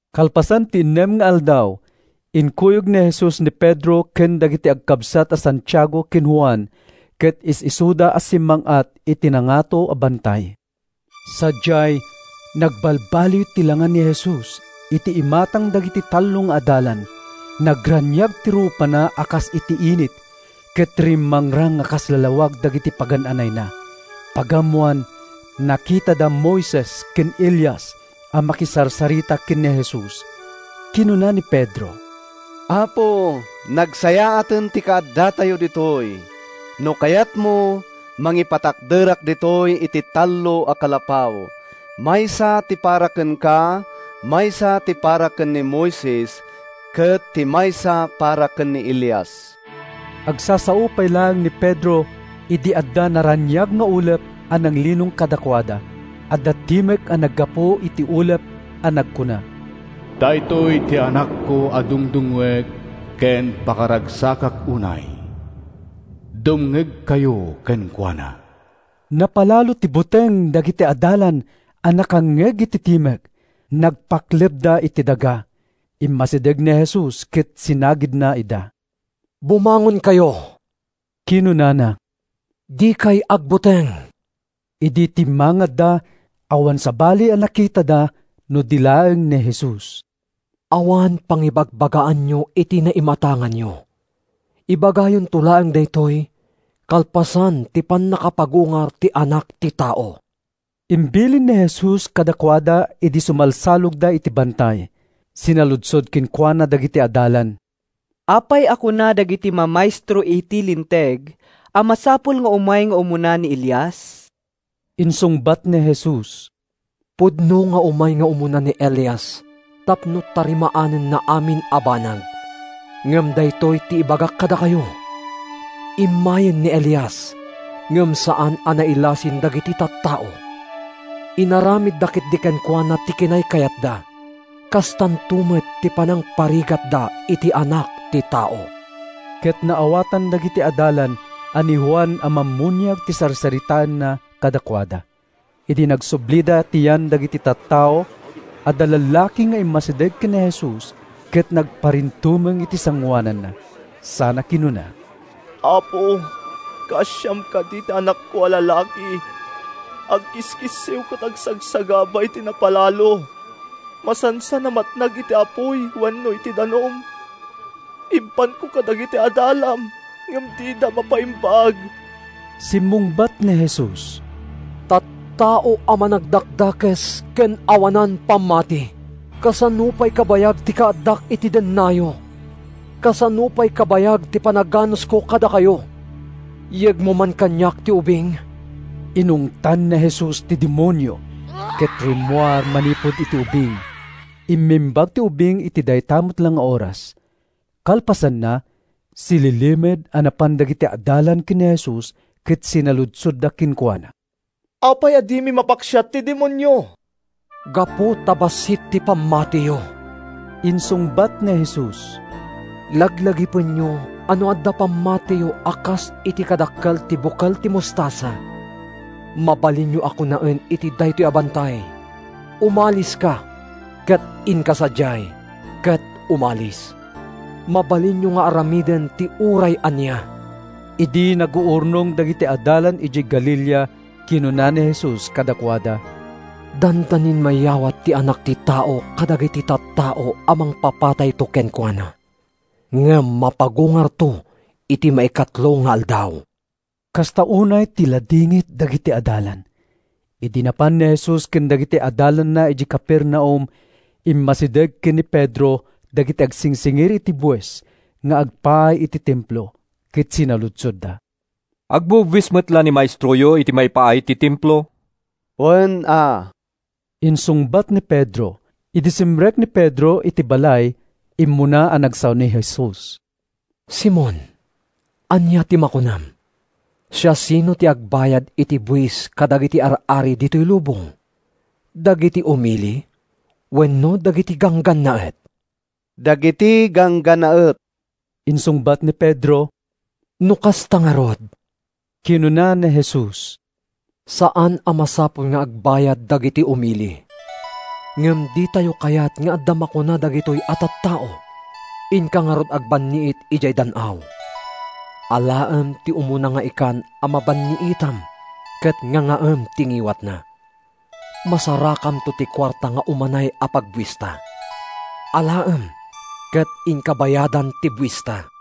Kalpasan ti innem nga aldaw, inkuyog ni Jesus ni Pedro ken dagiti agkabsat a Santiago ken Juan ket is-isuda a simmang-at iti nangato a bantay. Sadiay, nagbalbaliw ti langa ni Jesus iti imatang dagiti tallo nga adalan: nagraniag ti rupana a kas iti init, ket rimmangrang a kas lawag dagiti pagan-anayna. Pagammoan, nakitada da Moises ken Elias a makisarsarita ken ni Jesus. Kinuna ni Pedro, “Apo, nagsayaaten ti kaaddatayo ditoy! No kayatmo, mangipatakderak ditoy iti tallo a kalapaw: maysa ti para kenka, maysa ti para ken ni Moises, ket ti maysa para ken ni Elias.” Agsasao pay laeng ni Pedro idi adda naraniag nga ulep a nanglinong kadakuada. Adda timek a naggapu iti ulep a nagkuna, “Daytoy ti Anakko a dungdungngoek ken pakaragsakak unay. Dumngegkayo kenkuana!” Napalalo ti buteng dagiti adalan a nakangngeg iti timek. Nagpaklebda iti daga. Immasideg ni Jesus ket sinagidna ida. “Bumangonkayo,” kinunana. “Dikay agbuteng.” Idi timmangadda, awan sabali a nakitada no di laeng ni Jesus. “Awan pangibagbagaanyo iti naimatanganyo. Ibagayonto laeng daytoy kalpasan ti pannakapagungar ti Anak ti Tao,” imbilin ni Jesus kadakuada idi sumalsalogda iti bantay. Sinaludsod kenkuana dagiti adalan, “Apay a kuna dagiti mamaestro iti Linteg a masapul nga umay nga umuna ni Elias?” Insungbat ni Jesus, “Pudno nga umay nga umuna ni Elias tapno tarimaanenna amin a banag. Ngem daytoy ti ibagak kadakayo: Immayen ni Elias ngem saan a nailasin dagiti tattao. Inaramidda ketdi kenkuana ti kinaykayatda. Kastanto met ti panangparigatda iti Anak ti Tao.” Ket naawatan dagiti adalan a ni Juan a Mammuniag ti sarsaritaenna kadakuada. Idi nagsublida iti yan dagiti tattao, adda lalaki nga immasideg ken ni Jesus ket nagparintumeng iti sangoananna sana kinuna, “Apo, kaasiam kadi ti anakko a lalaki. Agkiskissiw ket agsagsagaba iti napalalo. Masansan a matnag iti apuy wenno iti danum. Impanko kadagiti adalam ngem dida mapaimbag.” Simmungbat ni Jesus, “Tattao a managdakdakes ken awanan pammati! Kasano pay kabayag ti kaaddak iti dennayo? Kasano pay kabayag ti panaganusko kadakayo? Yegyo man kaniak ti ubing!” Inungtan ni Jesus ti demonio, ket rimmuar manipud iti ubing. Immimbag ti ubing iti dayta met la nga oras. Kalpasanna, sililimed a napan dagiti adalan ken ni Jesus ket sinaludsodda kenkuana, “Apay a dimi mapaksiat ti demonio?” “Gapu ta bassit ti pammatiyo,” insungbat ni Jesus. “Laglagipenyo a no adda pammatiyo a kas iti kadakkel ti bukel ti mostasa, mabalinyo a kunaen iti daytoy a bantay, ‘Umaliska ket inka sadiay,’ ket umalis. Mabalinyo nga aramiden ti uray ania!” Idi naguurnong dagiti adalan idiay Galilea, kinuna ni Jesus kadakuada, “Dandanin mayawat ti Anak ti Tao kadagiti tattao a mangpapatayto kenkuana. Ngem mapagungarto iti maikatlo nga aldaw.” Kasta unay ti ladingit dagiti adalan. Idi napan ni Jesus ken dagiti adalanna idiay Capernaum, immasideg ken ni Pedro dagiti agsingsingir iti buis nga agpaay iti Templo, ket sinaludsodda. “Agbubuis met la ni maestroyo iti maipaay iti Templo?” “Wen, a,” insungbat ni Pedro. Idi simrek ni Pedro iti balay, immuna a nagsao ni Jesus, “Simon, ania ti makunam? Siasino ti agbayad iti buis kadagiti ar-ari ditoy lubong? Dagiti umili wenno dagiti ganggannaet?” “Dagiti ganggannaet,” insungbat ni Pedro. “No kasta ngarud,” kinuna ni Jesus, “saan a masapul nga agbayad dagiti umili. Ngem ditayo kayat nga adda makuna dagitoy a tattao. Inka ngarud agbanniit idiay dan-aw. Alaem ti umuna nga ikan a mabanniitam ket ngangaem ti ngiwatna. Masarakamto ti kuarta nga umanay a pagbuista. Alaem ket inka bayadan ti buista.”